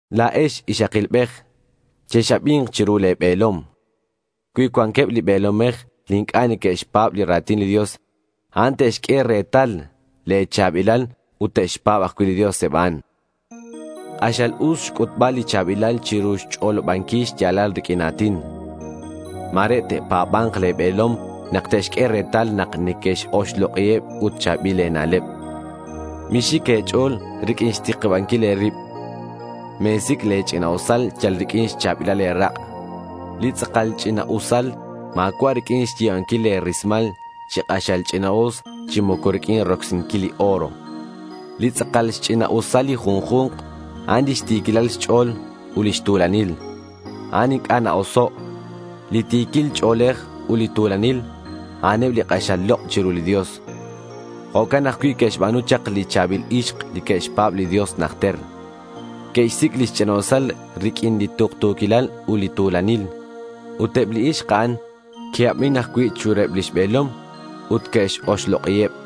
La̱ex ixakilbej chex-abi̱nk chiru le̱ be̱lom. Cui cuanqueb li be̱lomej li inc'a' neque'xpa̱b li ra̱tin li Dios, a'an te'xq'ue retal le̱ cha̱bilal ut te'xpa̱b ajcui' li Dios eb a'an. K'axal us xc'utbal li cha̱bilal chiru xch'olobanquil xya̱lal riq'uin a̱tin. Ma̱re te'pa̱ba̱nk le̱ be̱lom nak te'xq'ue retal nak neque-oxlok'iheb ut cha̱bil e̱na'leb. Mixic e̱ch'o̱l riq'uin xtikibanquil e̱rib. Me̱sic' le̱ ch'ina'usal yal riq'uin xcha̱bilal le̱ rak'. Li tz'akal ch'ina'usal ma̱cua' riq'uin xyi̱banquil le̱ rismal chi k'axal ch'ina'us chi moco riq'uin rocsinquil li oro. Li tz'akal xch'ina'usal li junju̱nk, a'an lix ti̱quilal xch'o̱l ut lix tu̱lanil. A'an inc'a' na-oso. Li ti̱quil ch'o̱lej ut li tu̱lanil, a'aneb li k'axal lok' chiru li Dios. Jo'can ajcui' que'xba̱nu chak li cha̱bil ixk li que'xpa̱b li Dios najter. Que'xsic' lix ch'ina'usal riq'uin li tuktu̱quilal ut li tu̱lanil. Ut eb li ixk a'an que'abin ajcui' chiruheb lix be̱lom ut que'x-oxlok'iheb.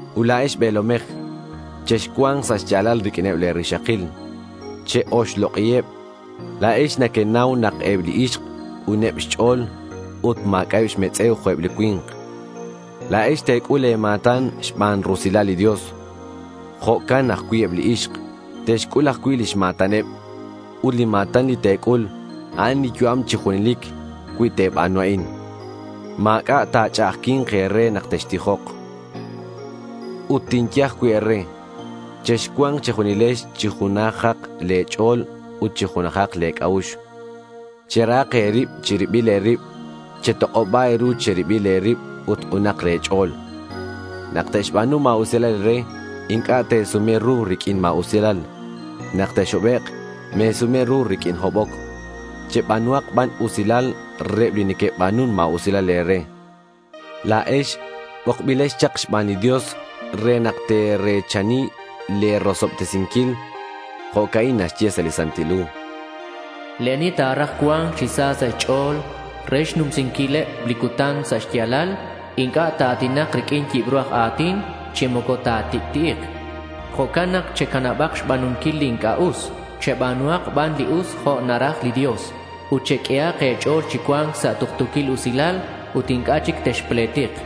Ut la̱ex be̱lomej, chexcua̱nk sa' xya̱lal riq'uineb le̱ rixakil. Che-oxlok'iheb. La̱ex nequenau nak eb li ixk k'uneb xch'o̱l ut ma̱c'a'eb xmetz'e̱uheb jo'eb li cui̱nk. La̱ex te̱c'ul le̱ ma̱tan xban rusilal li Dios. Jo'can ajcui' eb li ixk, te'xc'ul ajcui' lix ma̱taneb. Ut li ma̱tan li te̱c'ul, a'an li yu'am chi junelic. Cui te̱ba̱nu a'in, ma̱c'a' ta̱ch'a'ajqui̱nk e̱re nak textijok. Ut tinye ajcui' e̱re, chexcua̱nk che̱junilex chi junajak le̱ ch'o̱l ut chi junajak le̱ c'a'ux. Cherahak e̱rib che̱ribil e̱rib. Chetok'oba e̱ru che̱ribil e̱rib ut k'unak le̱ ch'o̱l. Nak te'xba̱nu ma̱usilal e̱re, inc'a' te̱sume ru riq'uin ma̱usilal. Nak texhobek', me̱sume ru riq'uin hoboc. Cheba̱nuhak ban usilal reheb li neque'ba̱nun ma̱usilal e̱re. La̱ex bokbilex chak xban li Dios re nak te̱re̱chani le̱ rosobtesinquil. Jo'ca'in naxye sa' li Santil Hu: Li ani ta̱raj cua̱nc chi sa sa' xch'o̱l re tixnumsiheb li cutan sa' xya̱lal, inc'a' ta̱a̱tinak riq'uin yibru a̱tin chi moco ta̱tic'ti'ik. Jo'can nak checanabak xba̱nunquil li inc'a' us. Cheba̱nuhak ban li us, jo' naraj li Dios. Ut cheq'uehak e̱ch'o̱l chi cua̱nc sa' tuktu̱quil usilal ut inc'a' chic texpletik.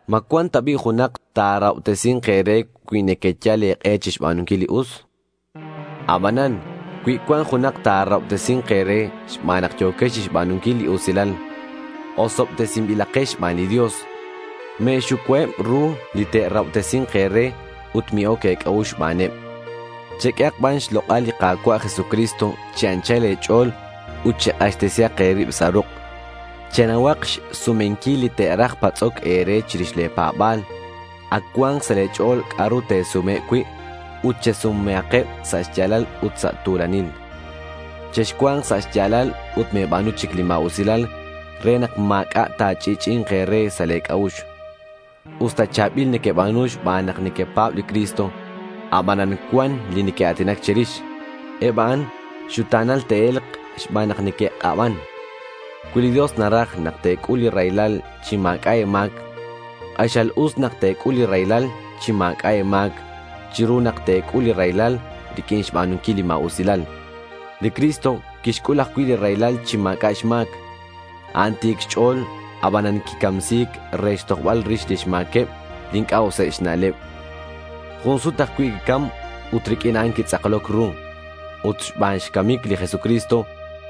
¿Ma cuan ta bi' junak ta̱rahobtesi̱nk e̱re cui nequeyal e̱k'e chixba̱nunquil li us? Abanan cui cuan junak ta̱rahobtesi̱nk e̱re xban nak yo̱quex chixba̱nunquil li usilal, osobtesinbilex xban li Dios. Me̱xucuaheb ru li te'rahobtesi̱nk e̱re ut mi-oc e̱c'a'ux xbaneb. Cheq'uehak ban xlok'al li Ka̱cua' Jesucristo chi anchal e̱ch'o̱l ut chek'axtesihak e̱rib sa' ruk'. Chenauhak xsumenquil li te'raj patz'oc e̱re chirix le̱ pa̱ba̱l. Ac cua̱nk sa' le̱ ch'o̱l c'a'ru te̱sumeheb cui'. Ut chesumehakeb sa' xya̱lal ut sa' tu̱lanil. Chexcua̱nk sa' xya̱lal ut me̱ba̱nu chic li ma̱usilal re nak ma̱c'a' ta̱ch'i'ch'i'i̱nk e̱re sa' le̱ c'a'ux. Usta cha̱bil nequeba̱nu xban nak nequepa̱b li Cristo, abanan cuan li neque'a̱tinac che̱rix. Eb a'an xuta̱nal te'e̱lk xban nak neque'k'aban. Cui li Dios naraj nak te̱c'ul li raylal chi ma̱c'a' e̱ma̱c, k'axal us nak te̱c'ul li raylal chi ma̱c'a' e̱ma̱c chiru nak te̱c'ul li raylal riq'uin xba̱nunquil li ma̱usilal. Li Cristo quixc'ul ajcui' li raylal chi ma̱c'a' xma̱c. A'an ti̱c xch'o̱l abanan quicamsi̱c re xtojbal rix lix ma̱queb li inc'a' useb xna'leb. Jun sut ajcui' quicam ut riq'uin a'an quitz'akloc ru. Ut xban xcamic li Jesucristo,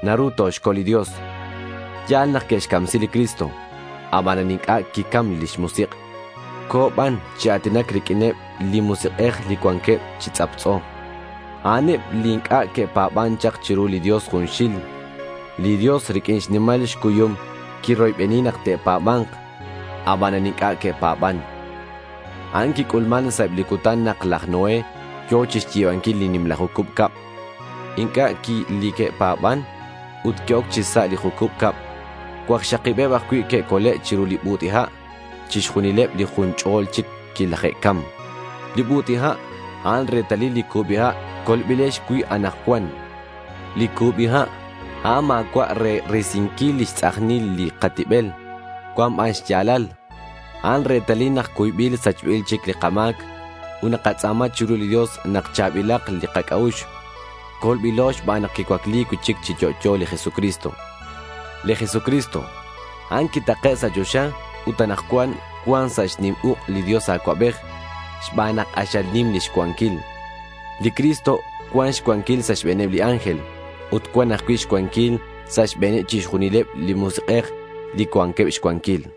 naru toxcol li Dios. Ya̱l nak que'xcamsi li Cristo. Abanan inc'a' quicam lix musik'. Co̱ ban chi a̱tinac riq'uineb li musik'ej li cuanqueb chi tz'aptz'o. A'an eb li inc'a' que'pa̱ban chak chiru li Dios junxil. Li Dios riq'uin xnimal xcuyum, quiroybeni nak te'pa̱ba̱nk. Abanan inc'a' que'pa̱ban. A'an quic'ulman sa' eb li cutan nak laj Noé yo̱ chixyi̱banquil li nimla jucub cab. Inc'a' q'ui li que'pa̱ban ut que'oc chi sa' li jucub cab. Cuakxakibeb ajcui' que'cole' chiru li but'i ha'. Chixjunileb li jun ch'o̱l chic quilaje'cam. Li but'i ha', a'an retalil li cubi ha' colbilex cui' anakcuan. Li cubi ha', a'an ma̱cua' re risinquil lix tz'ajnil li katibel. Cuan ban xya̱lal. A'an retalil nak cuybil sachbil chic li kama̱c. Ut nakatz'a̱ma chiru li Dios nak cha̱bilak li kac'a'ux. Colbilo xban nak quicuacli cui'chic chi yo'yo li Jesucristo. Li Jesucristo, a'an quitake' sa' choxa ut anakcuan cuan sa' xnim uk' li Dios Acuabej xban nak k'axal nim lix cuanquil. Li Cristo cuan xcuanquil sa' xbe̱neb li ángel. Ut cuan ajcui' xcuanquil sa' xbe̱neb chixjunileb li musik'ej li cuanqueb xcuanquil.